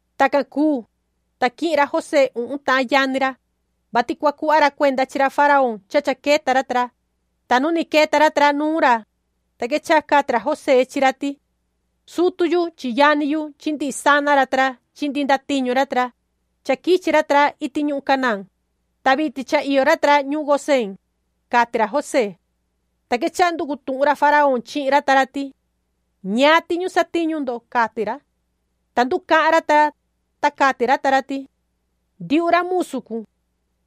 Tacan cuu, ta quihin ra José uhun tahan yani ra, vati cua cuhva ra cuenda chi ra faraón cha cha queta ra ta ra, ta nu ni queta ra ta ra nuun ra, ta quechaha cati ra José chi ra ti: ―Sutu yu chi yani yu chi ndihi sana ra ta ra chi ndihi ndatiñu ra, cha quichi ra ta ra iti ñuhun Canaán, ta vitin cha iyo ra ta ra ñuhun Gosén ―cati ra José. Ta quechaha nducu tuhun ra faraón chihin ra ta ra ti: ―¿Ñaan tiñu satiñu ndo? ―cati ra. Ta nducahan ra ta ra, ta cati ra ta ra ti: ―Ndiuhu ra musu cun,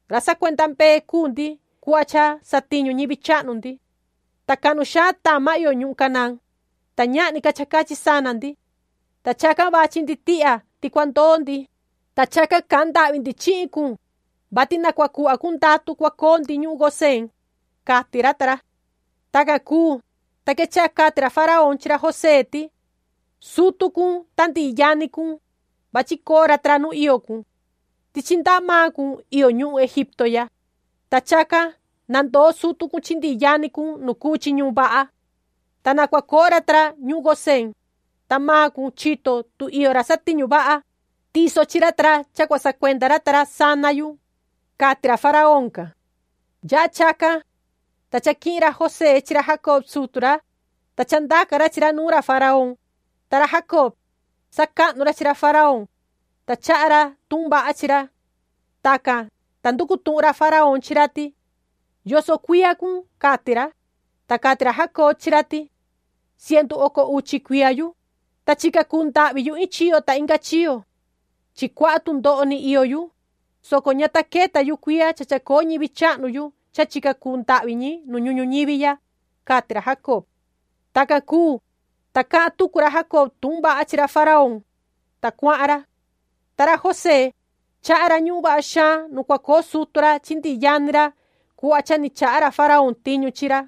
ra sacuenda mbee cuu ndi cuhva cha satiñu ñivi chahnu ndi. Ta cahnu xaan tama iyo ñuhun Canaán, ta ñahni ca cha cachi sana ndi. Ta chacan vachi ndi tihya ti cua ndoo ndi, ta chacan cahan ndahvi ndi chihin cun, vati na cua cuhva cun ndatu cha cua coo ndi ñuhun Gosén ―cati ra ta ra. Tacan cuu, ta quechaha cati ra faraón chi ra José ti: ―Sutu cun ta ndihi yani cun, vachi coo ra ta ra nu iyo cun. Tichi ndaha maan cun iyo ñuhun Egipto ya, ta chacan na ndoo sutu cun chi ndihi yani cun nu cuu chi ñuhun vaha. Ta na cua coo ra ta ra ñuhun Gosén, ta maan cun chito tu iyo ra satiñu vaha, tiso chi ra ta ra cha cua sacuenda ra ta ra sana yu ―cati ra faraón can. Yaha chacan, ta cha quihin ra José chi ra Jacob sutu ra, ta cha ndaca ra chi ra nuun ra faraón, ta ra Jacob, sacahnu ra chi ra faraón, ta chaha ra tuhun vaha chi ra. Tacan, ta nducu tuhun ra faraón chi ra ti: ―¿Yoso cuiya cun? ―cati ra. Ta cati ra Jacob chi ra ti: ―Cientu oco uchi cuiya yu, ta chica cuu ndahvi yu iin chiyo ta inga chiyo. Chi cuaha tundoho ni iyo yu, soco ña ta queta yu cuiya cha chacoo ñivi chahnu yu cha chica cuu ndahvi ñi nu ñuhun ñuñivi ya ―cati ra Jacob. Tacan cuu, ta cahan tucu ra Jacob tuhun vaha chi ra faraón, ta cuahan ra. Ta ra José, chaha ra ñuhun vaha xaan nu cua coo sutu ra chi ndihi yani ra cuhva cha ni chaha ra faraón tiñu chi ra.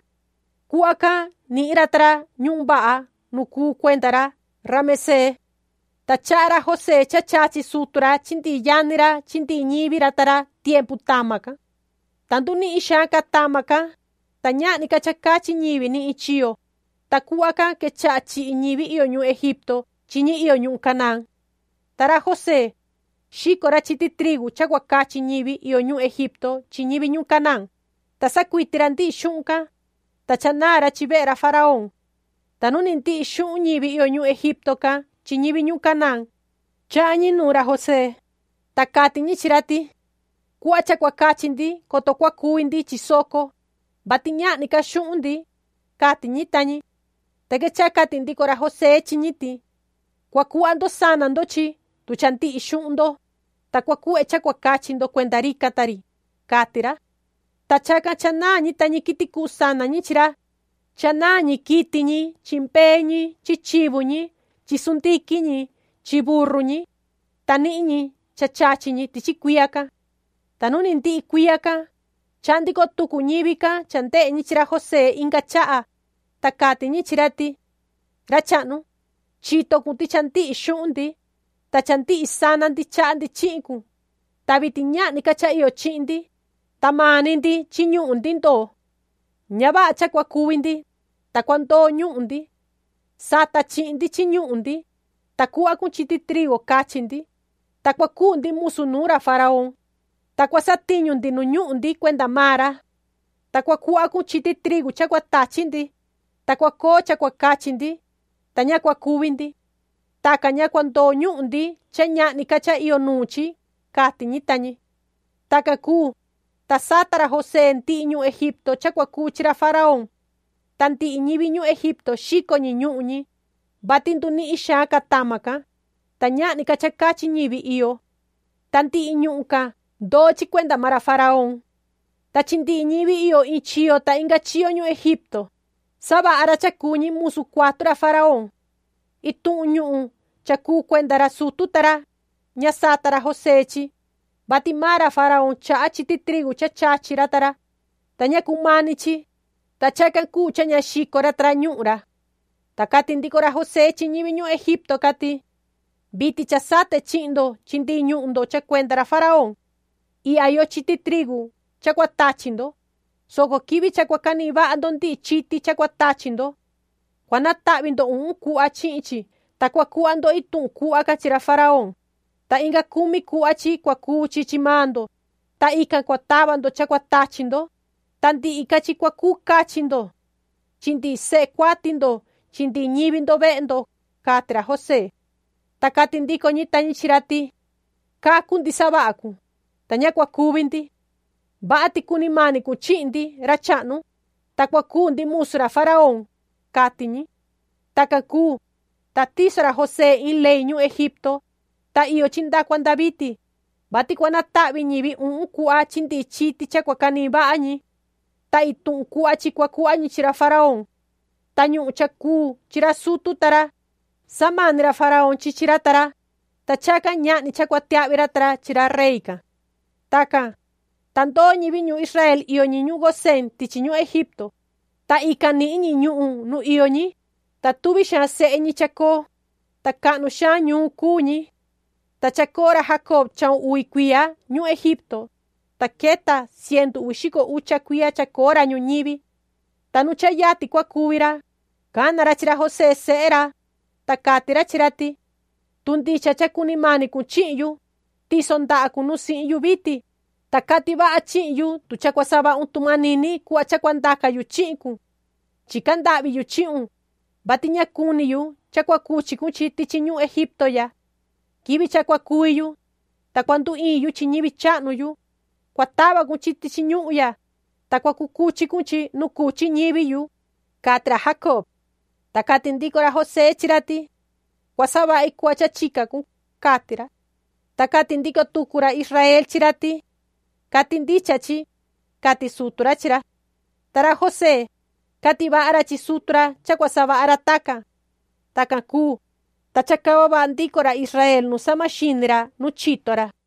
Cuhva can nihin ra ta ra ñuhun vaha nu cuu cuenda ra Ramesee. Ta chaha ra José cha chachi sutu ra chi ndihi yani ra chi ndihi ñivi ra ta ra tiempu tama can. Ta ndunihin xaan ca tama can, ta ñahni ca cha cachi ñivi ni iin chiyo, ta cuhva can quechaha chihi ñivi iyo ñuhun Egipto chi ñi iyo ñuhun Canaán. Ta ra José, xico ra chiti trigu cha cua cachi ñivi iyo ñuhun Egipto chi ñivi ñuhun Canaán, ta sacuiti ra ndihi xuhun can, ta cha naa ra chi vehe ra faraón. Ta nu ndihi xuhun ñivi iyo ñuhun Egipto can chi ñivi ñuhun Canaán, chahan ñi nuun ra José, ta cati ñi chi ra ti: ―Cuhva cha cua cachi ndi coto cua cuvi ndi chi soco, vati ñahni ca xuhun ndi ―cati ñi ta ñi. Ta quechaha cati ndico ra José chi ñi ti: ―Cua cuhva ndo sana ndo chi tu cha ndihi xuhun ndo, ta cua cuhve cha cua cachi ndo cuenda rican ta ri ―cati ra. Ta chacan cha naan ñi ta ñi quiti cuhu sana ñi chi ra, cha naan ñi quiti ñi chi mbee ñi chi chivu ñi chi sundiquin ñi chi burru ñi, ta nihin ñi cha chachi ñi tichi cuiya can. Ta nu ni ndihi cuiya can, chahan ndico tucu ñivi can cha ndehe ñi chi ra José inga chaha, ta cati ñi chi ra ti: ―Ra chahnu, chito cun ti cha ndihi xuhun ndi, ta cha ndihi sana ndi chaha ndi chihin cun. Ta vitin ñahni ca cha iyo chihin ndi, ta maan ni ndi chi ñuhun ndi ndoo. Ña vaha cha cua cuvi ndi, ta cua ndoo ñuhun ndi. Sata chihin ndi chi ñuhun ndi, ta cuhva cun chiti trigu cachi ndi, ta cua cuu ndi musu nuun ra faraón, ta cua satiñu ndi nu ñuhun ndi cuenda maan ra. Ta cua cuhva cun chiti trigu cha cua tachi ndi, ta cua coo cha cua cachi ndi, ta ña cua cuvi ndi. Tacan ña cua ndoo ñuhun ndi cha ñahni ca cha iyo nuun chi ―cati ñi ta ñi. Tacan cuu, ta sata ra José ndihi ñuhun Egipto cha cua cuu chi ra faraón. Ta ndihi ñivi ñuhun Egipto xico ñi ñuhun ñi, vati ndunihin xaan ca tama can, ta ñahni ca cha cachi ñi iyo. Ta ndihi ñuhun can ndoo chi cuenda maan ra faraón. Ta chi ndihi ñivi iyo iin chiyo ta inga chiyo ñuhun Egipto, savaha ra cha cuu ñi musu cuatu ra faraón. Ituhun ñuhun cha cuu cuenda ra sutu ta ra, ña sata ra José chi, vati maan ra faraón chaha chiti trigu cha chachi ra ta ra, ta ña cumani chi, ta chacan cuu cha ña xico ra ta ra ñuhun ra. Ta cati ndico ra José chi ñivi ñuhun Egipto can ti: ―Vitin cha sate chihin ndo chi ndihi ñuhun ndo cha cuenda ra faraón. Ihya iyo chiti trigu cha cua tachi ndo, soco quivi cha cua canihin vaha ndo ndihi chiti cha cua tachi ndo, cua natahvi ndo uhun cuhva chihin chi, ta cua cuhva ndo ituhun cuhva can chi ra faraón, ta inca cumi cuhva chi cua cuu chi chi maan ndo, ta ican cua tava ndo cha cua tachi ndo, ta ndihi ca chi cua cachi ndo chi ndihi sehe cuati ndo chi ñivi ndo vehe ndo ―cati ra José. Ta cati ndico ñi ta ñi chi ra ti: ―Cacu ndi savaha cun, ta ña cua cuvi ndi. Vaha ti cuni mani cun chihin ndi, ra chahnu, ta cua cuu ndi musu ra faraón ―cati ñi. Tacan cuu, ta tiso ra José iin ley ñuhun Egipto, ta iyo chi nda cua nda vitin, vati cua natahvi ñi uhun cuhva chi ndihi chiti cha cua canihin vaha ñi. Ta ituhun cuhva chi cua cuhva ñi chi ra faraón. Ta ñuhun cha cuu chi ra sutu ta ra, samani ra faraón chi chi ra ta ra, ta chacan ñahni cha cua tiahvi ra ta ra chi ra rey can. Tacan, ta ndoo ñivi ra Israel iyo ñi ñuhun Gosén tichi ñuhun Egipto, ta ican nihin ñi ñuhun nu iyo ñi, ta tuvi xaan sehe ñi chacoo, ta cahnu xaan ñuun cuu ñi. Ta chacoo ra Jacob chahun uvi cuiya ñuhun Egipto, ta queta cientu uvi xico ucha cuiya chacoo ra ñuñivi. Ta nu cha yatin cua cuvi ra, cana ra chi ra José sehe ra, ta cati ra chi ra ti: ―Tu ndicha cha cuni mani cun chihin yu, tiso ndaha cun nu sihin yu vitin, ta cati vaha chihin yu tu cha cua savahun tu manini cuhva cha cua ndaca yu chihin cun. Chica ndahvi yu chihun, vati ña cuni yu cha cua cuchi cun chi tichi ñuhun Egipto ya. Quivi cha cua cuvi yu, ta cua nduiin yu chi ñivi chahnu yu, cua tava cun chi tichi ñuhun ya, ta cua cuchi cun chi nu cuchi ñivi yu ―cati ra Jacob. Ta cati ndico ra José chi ra ti: ―Cua savahi cuhva cha chica cun ―cati ra. Ta cati ndico tucu ra Israel chi ra ti: ―Cati ndicha chi ―cati sutu ra chi ra. Ta ra José, cati vaha ra chi sutu ra cha cua savaha ra tacan. Tacan cuu, ta chacava vaha ndico ra Israel nu sahma xini ra nu chito ra.